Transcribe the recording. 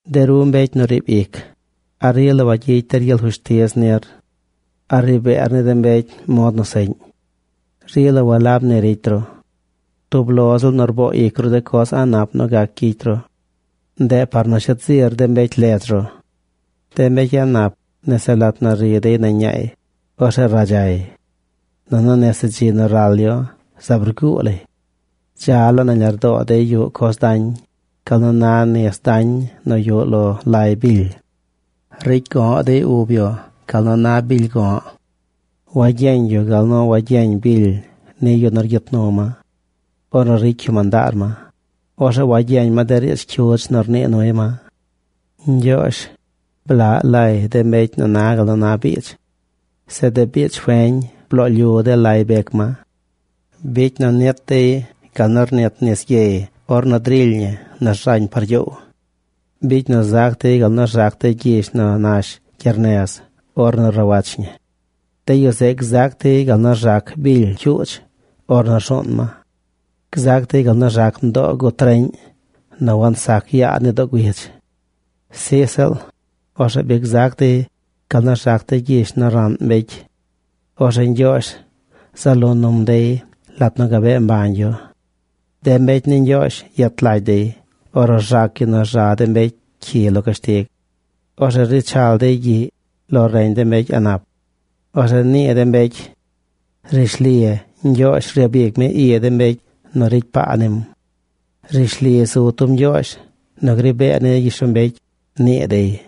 De ru mbecy nu riib ic, ¿a rila wayicy der gyel fushtiz nir? ¿A ri beer ni de mbecy mod nu seꞌñ? ¡Rila walab ni ricy ru! Tub lo ziꞌl nu rboo ic ru de coz a̱ꞌ nap nu gac gyicy ru. Ndeꞌ par nu shet zir de mbecy ledz ru. De mbecy a̱ꞌ nap nese lat nu ri dey nañ ñaay, orzeꞌ radzay. Nunu nese dzi nu ral yu zaab rguu lay. Dza laa nañ lardoo dey yuꞌ coz dañ, gal nu na nis dañ nu yuꞌ lo lay bily. Ricy go̱ꞌ dey ub yu, gal nu na bily go̱ꞌ. Wagyeñ yu gal nu wagyeñ bily ni yu nu rgyit nu ma. Ornu ricy yu mandaar ma, orzeꞌ wagyeñ ma de riidz cyudz nu rnii nuy ma. Ñgyoozh, blaꞌ lay de mbecy nu na gal nu na biidz. Zeꞌ de biidz feñ bloo lyu de lay bec ma. Bicy nu nit dey gal nu rnit nis gyey ornu drily ñi nu rzañ par gyoow. Bicy nu zac dey gal nu rzac de gyish nu nash gyernez ornu rawach ñi. De yu zeꞌ gzac dey gal nu rzac bily cyuudz ornu rzuun ma. Gzac dey gal nu rzac mdoo gut reꞌñ nu wazac yaa ni doo güidz. Sij ziꞌl, orzeꞌ bi gzac dey gal nu rzac de gyish nu raꞌn mbecy. Orzeꞌ Ñgyoozh zaꞌ lo num dey lat nu gabee mbañ yu. De mbecy ni Ñgyoozh yet lagy dey ornu rzac yu nu rza de mbecy cyi lo cashtig. Orzeꞌ ri chal dey gyiꞌy lo reñ de mbecy a̱ꞌ nap. Orzeꞌ nii de mbecy: “Rishli Ñgyoozh ryabic mi i de mbecy nu ricy paa nim. Rishli zu tub Ñgyoozh nu gri bee ni gyishlombecy”, nii dey.